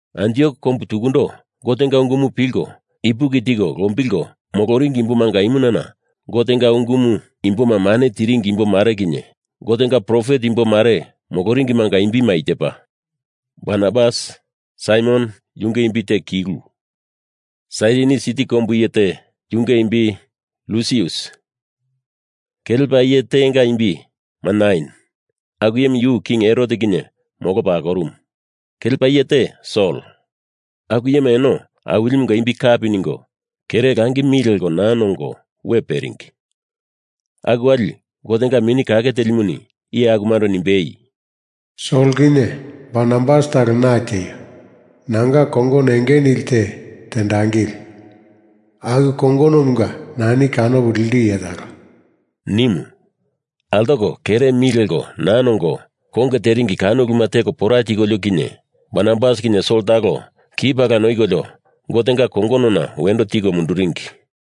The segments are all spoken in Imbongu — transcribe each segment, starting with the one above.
Antiok kombu tukundo Gotenga ungumu pilko ipuki tiko lombilko moloringi imbomanga imunana Gotenga ungumu imboma mane tiringi imbo mare kinye Gotenga profet imbo mare moloringimanga imbima i tepa: Barnabas, Saimon (yunge imbi te Kilu), Sairini siti kombu iye te yunge imbi Lusius, kelepa iye tenga imbi Manain (aku iyemu yu King Herot kinye molopa akorumu). Kelepa iye te Sol. Aku iyema eno Awilimunga imbi kapi ningo kere langi mi leko naa nongo we peringi. Aku wali Gotenga Mini Kake Telimuni iye akumando nimbei, “Sol kinye Barnabas talo na tieio. Nanga kongono enge nili te tendangili. Aku kongonomunga nani kanopo lindu iye talo,” nimu. Altoko kere mi leko naa nongo konge teringi kano uluma teko pora tikolio kinye Barnabas kinye Sol talo ki pala noikolio Gotenga kongonona wendo tiko munduringi.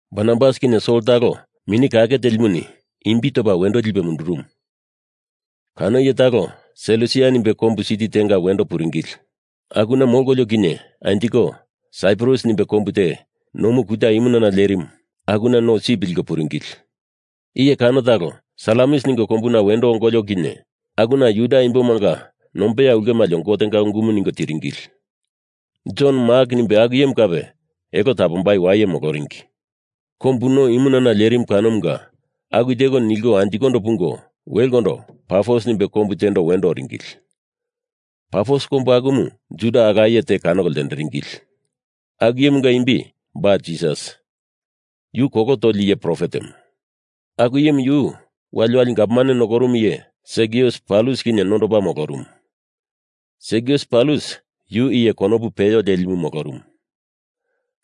Barnabas kinye Sol talo Mini Kake Telimuni imbi topa wendo lipe mundurumu. Kano iye talo Selusia nimbe kombu siti tenga wendo puringili. Akuna molkolio kinye anjiko Saiprus nimbe kombu te nomu kuta imunana lerimu akuna no sip liko puringili. Iye kano talo Salamis ningo kombuna wendo ongolio kinye akuna Juda imbomanga nombeya ulkemalio Gotenga ungumu ningo tiringili. Jon Mak nimbe aku iyemu kape elo tapombai waye moloringi. Kombu no imunana lerimu kanomunga aku teko nilko anjikondo pungo welendo Pafos nimbe kombu tendo wendo oringili. Pafos kombu akuna Juda ala iye te kanoko ltenderingili. Aku iyemunga imbi Ba-Jisas. Yu kolo toli iye profetemu. Aku iyemu yu waliwali gavman nokorumu iye Sergius Paulus kinye nondopa molorumu. Sergius Paulus yu iye konopu peyo lelimu molorumu.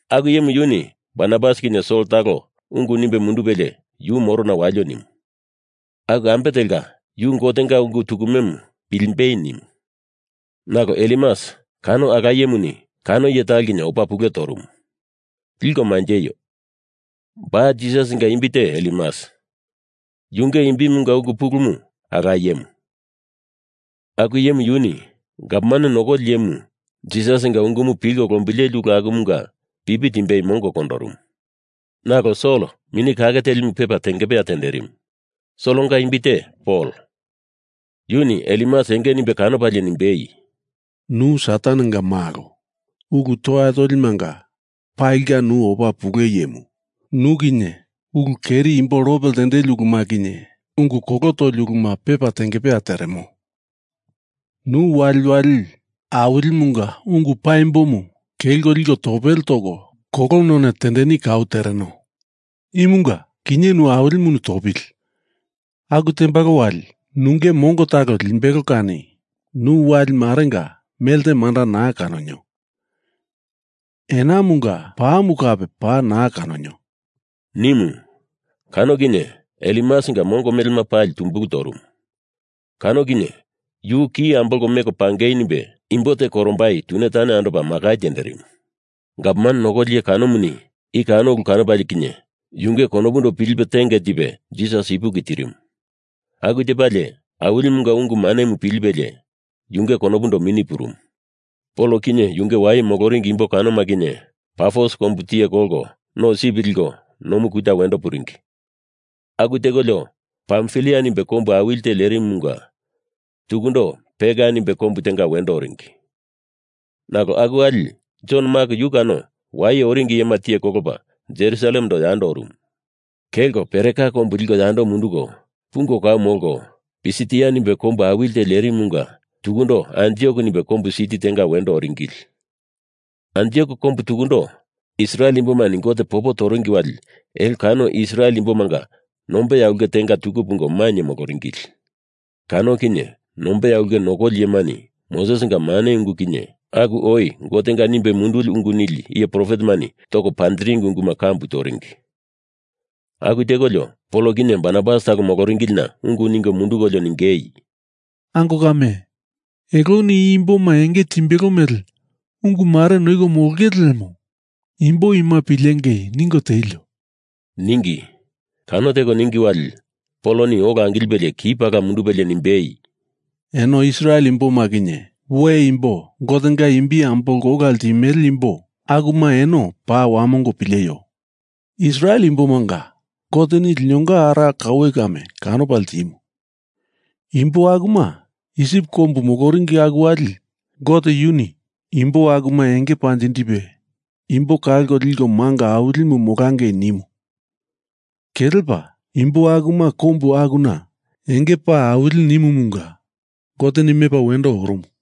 Aku iyemu yuni Barnabas kinye Sol talo ungu nimbe mundupelie yu morona walio nimu. Aku ambe telka yu Gotenga ungu tukumemu pilimbei nimu. Nalo Elimas kano ala iyemuni kano iye talo kinye opa pule torumu. (Liko manjeio, Ba-Jisasinga imbi te Elimas. Yunge imbimunga ungu pulumu ala iyemu.) Aku iyemu yuni gavman nokoli iyemu Jisasinga ungumu pilko lombileli ulu akumunga pipi timbei mongo kondorumu. Nalo Sol Mini Kake Telimu pepa tengepeya tenderimu. Solonga imbi te Pol. Yuni Elimas enge nimbe kanopalie nimbei, “Nu Satanenga malo! Ulu toya tolimanga palinga nu opa pule iyemu. Nu kinye ulu keri imbo lope ltendeli uluma kinye ungu kolo toli uluma pepa tengepeya teremo. Nu waliwali Awilimunga ungu paimbomu kelko liko topele toko kolo none tendeni kau tereno. Imunga kinye nu Awilimuni topili! Aku tembalo wali nunge mongo talo limbelo kani nu wali marenga melte manda naa kanonio. Enamunga pamu kape paa naa kanonio,” nimu. Kano kinye Elimasinga mongona melema pali tumbulu torumu. Kano kinye yu ki ambolko meko pangei nimbe imbo te korombai tune tane andopa makai tenderimu. Gavman nokoli iye kanomuni i kano ulu kanopalie kinye yunge konopundo pilipe tenge tipe Jisas ipuki tirimu. Aku tepalie Awilimunga ungu manemu pilipelie yunge konopundo mini purumu. Pol kinye yunge waye moloringi imbo kanoma kinye Pafos kombu tiye kolko no sip liko nomu kuta wendo puringi. Aku tekolio Pamfilia nimbe kombu awili te lerimumunga tukundo Perga nimbe kombu tenga wendo oringi. Nalo aku wali Jon Mak yu kano waye andoringi iyema tiye kolopa Jerusalemendo yando orumu. Kelko Pereka kombu liko yando munduko pungo kau molko Pisitia nimbe kombu awili te lerimumunga tukundo Antiok nimbe kombu siti tenga wendo oringili. Antiok kombu tukundo Israel imbomani Gote popo toringi wali elo kano Israel imbomanga nombeya ulke tenga tuku pungo mainye moloringili. Kano kinye nombeya ulke nokoli iyemani Mosesinga mane ungumu kinye aku oi Gotenga nimbe munduli ungu nili iye profetemani toko panjiringi unguma kambu toringi. Aku tekolio Pol kinye Barnabas talo moloringilina ungu ningo mundukolio ningei, “Ango kame, eloni i imboma enge timbelo mele ungu mare noiko molongele lemo imbo ima pilengei ningo tielio,” ningi. Kano teko ningi wali Poloni ola angilipelie ki pala mundupelie nimbei, “Eno Israel imboma kinye we imbo Gotenga imbi ambolko ola ltimele imbo akuma eno paa wamongo pileio! Israel imbomanga Goteni linonga ara kaue kame kanopa ltimu. Imbo akuma Isip kombu moloringi aku wali Gote yuni imbo akuma enge panjindipe imbo kalko liko manga awilimu molangei nimu. Kelepa imbo akuma kombu akuna enge paa awili nimumunga Goteni mepa wendo orumu.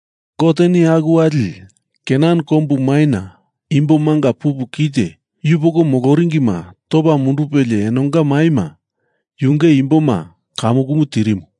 Goteni aku wali Kenan kombu maina imbo manga pupu kite yupoko moloringima topa mundupelie enonga maima yunge imboma kamukumu tirimu.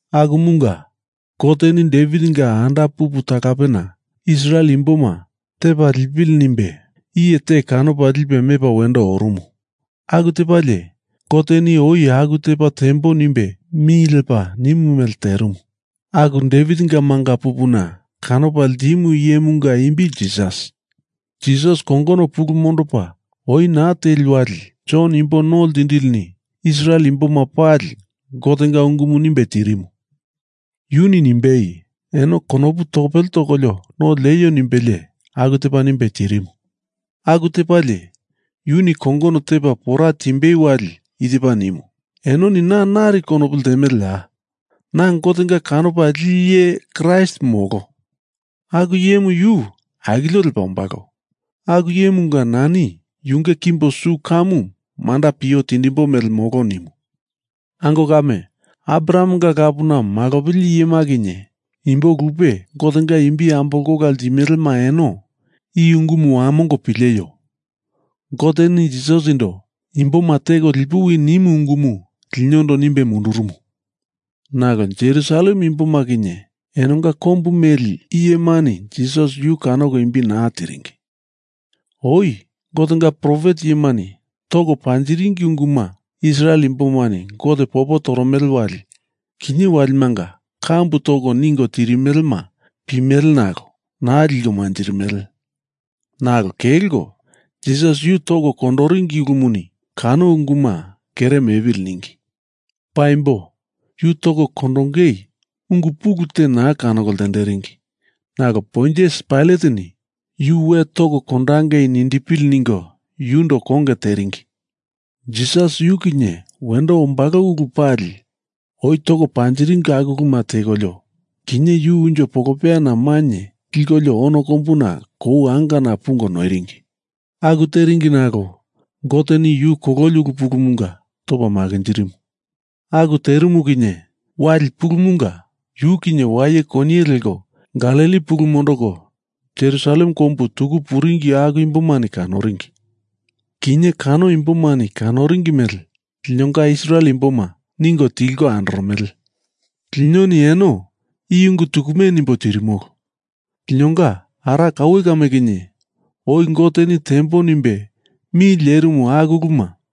Akumunga Goteni Devitinga anda pupu talapena Israel imboma tepa lipili nimbe iye te kanopa lipe mepa wendo orumu. Aku tepalie Goteni oi aku tepa tembo nimbe mi lepa nimu mele terimu. Aku Devitinga manga pupuna kanopa ltimu iyemunga imbi Jisas. Jisas kongono pulu mondopa oi naa teli wali Jon Imbo No Ltindilini Israel imboma pali Gotenga ungumu nimbe tirimu. Yuni nimbei, ‘Eno konopu topele tokolio no lieio,’ nimbelie aku tepa nimbe tirimu. Aku tepalie yuni kongono tepa pora timbei wali i tepa nimu, ‘Enoni na nari konopu ltemeleya? Na Gotenga kanopa lili iye Kraist molo. Aku iyemu yu akilio lepa ombalo. Aku iyemunga nani yunge kimbo su kamu manda pio tindimbo mele molo,’ nimu. Ango kame, Abrahamenga lapuna malopili iyema kinye imbo lupe Gotenga imbi ambolko ola ltimelema eno i ungumu wamongo pileio! Goteni Jisasindo imboma teko lipuwi nimu ungumu linondo nimbe mundurumu. Nalo Jerusalem imboma kinye enonga kombu meli iyemani Jisas yu kanoko imbi naa tiringi. Oi Gotenga profet iyemani toko panjiringi unguma Israel imbomani Gote popo toromele wali kinye waliwalimanga kambu toko ningo tirimelema pimele nalo naa liko manjirimele. Nalo kelko Jisas yu toko kondoringi ulumuni kano unguma kere mepili ningi. Paimbo yu toko kondongei ungu pulu te naa kanoko ltenderingi nalo Pontius Pailateni yu we toko kondangei nindipili ningo yundo konge teringi. Jisas yu kinye wendo ombalo ulu pali oi toko panjiringi aku uluma tekolio kinye yu unjo polopeyana mainye likolio ono kombu kou angana pungo noiringi. Aku teringi nalo Goteni yu kololi ulu pulumunga topa makinjirimu. Aku terimu kinye wali pulumunga yu kinye waye koniye leko Galili pulu mondoko Jerusalem kombu tuku puringi aku imbomani kanoringi. Kinye kano imbomani kanoringi mele linonga Israel imboma ningo tilko andoromele. Linoni eno i ungu tukume nimbo tirimolo. Linonga ara kaue kame kinye oi Goteni tembo nimbe mi lerimu aku uluma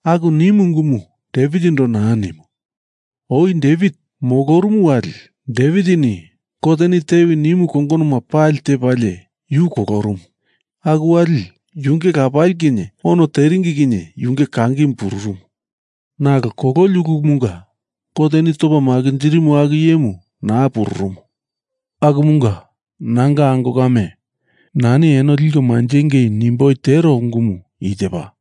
Aku nimu ungumu Devitindo naa nimu. Oi Devit molorumu wali Devitini Goteni tewi nimu kongonoma pali tepalie yu kolorumu. Aku wali yunge lapali kinye ono teringi kinye yunge kangimu pururumu. Nalo kololi ulumunga Goteni topa makinjirimu aku iyemu naa pururumu. Akumunga nanga ango kame, nani eno liko manjengei nimboi tero ungumu i tepa: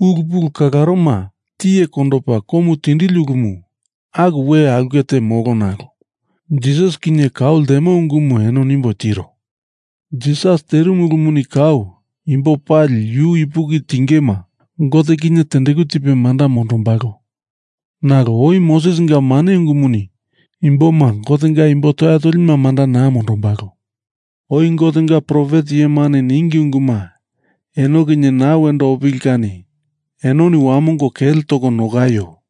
Ulu pulu kalaroma tiye kondopa komu tindili ulumu aku we aulke te molo nalo Jisas kinye kau ltemo ungumu eno nimbo tiro. Jisas terimu ulumuni kau imbo pali yu ipuki tingema Gote kinye tendeku tipe manda mondombalo. Nalo oi Mosesinga mane ungumuni imboma Gotenga imbo toya tolima manda naa mondombalo. Oi Gotenga profet iyemani ningi unguma eno kinye naa wendo opili kani enoni wamongo kele toko nokaio.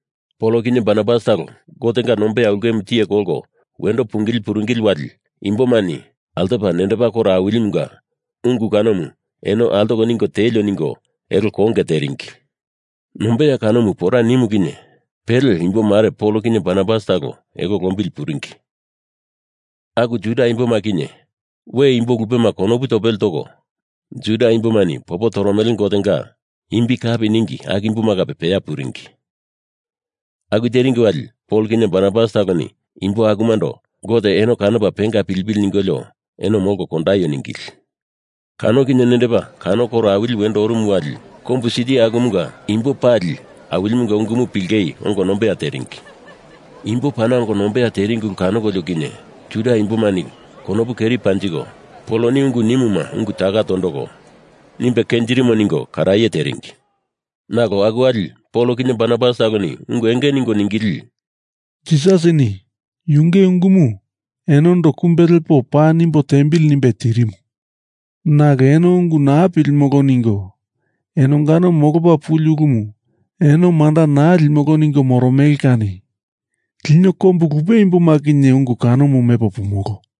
Pol kinye Barnabas talo Gotenga nombeya ulkemu tiye kolko wendo pungili puringili wali imbomani altopa nendepa koro awilimunga ungu kanomu eno altoko ningo tielio ningo elo konge teringi. Nombeya kanomu pora nimu kinye pele imbo mare Pol kinye Barnabas talo elo lombili puringi. Aku Juda imboma kinye we imbo lupema konopu topele toko Juda imbomani popo toromele Gotenga imbi kapi ningi aku imboma kape peya puringi. Aku teringi wali Pol kinye Barnabas taloni imbo akumando Gote eno kanopa penga pilipili ningolio eno molko kondaio ningili. Kano kinye nendepa kano koro awili wendo orumu wali kombu siti akumunga imbo pali Awilimunga ungumu pilingei ongo nombeya teringi. Imbo pana ongo nombeya teringi ulu kanokolio kinye Juda imbomani konopu keri panjiko Poloni ungu nimuma ungu taka tondoko nimbe kenjirimo ningo karaye teringi. Nalo aku wali Pol kinye Barnabas taloni ungu enge ningo ningili, “Jisasini yunge ungumu enondo kumbe lepo paa nimbo tiembili nimbe tirimu. Nalo eno ungu naa pilimolo ningo enongano molopa puli ulumu eno manda naa limolo ningo moromele kani lino kombu lupe imboma kinye ungu kanomu mepo pumolo.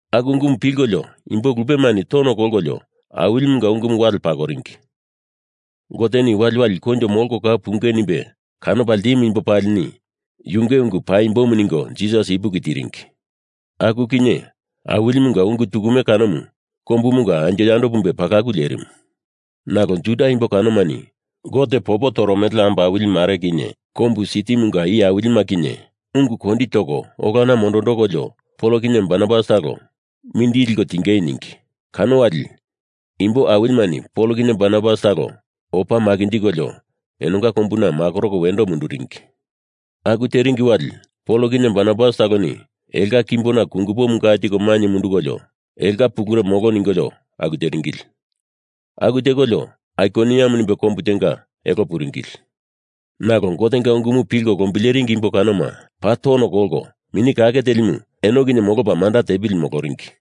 Aku ungumu pilkolio imbo lupemani tono kolkolio Awilimunga ungumu wale pakoringi. Goteni waliwali koinjo molko kau pungei nimbe kanopa ltimu imbo palini Yunge ungu paimbomu ningo Jisas ipuki tiringi. Aku kinye Awilimunga ungu tukume kanomu kombumunga anjo yando pumbe palaku lerimu. Nalo Juda imbo kanomani Gote popo toromele ambo awili mare kinye kombu sitimunga iye awilima kinye ungu kondi toko olona mondondokolio Pol kinye Barnabas talo mindili liko tiengei ningi. Kano wali imbo awilimani Pol kinye Barnabas talo opa makinjikolio enonga kombuna makoroko wendo munduringi. Aku teringi wali Pol kinye Barnabas taloni elonga kimbona kungupomu ga tiko mainye mundukolio elonga pulure molo ningolio aku teringili. Aku tekolio Aikoniam nimbe kombu tenga elo puringili. Nalo Gotenga ungumu pilko lombileringi imbo kanoma paa tono kolko Mini Kake Telimu eno kinye molopa manda tepili moloringi.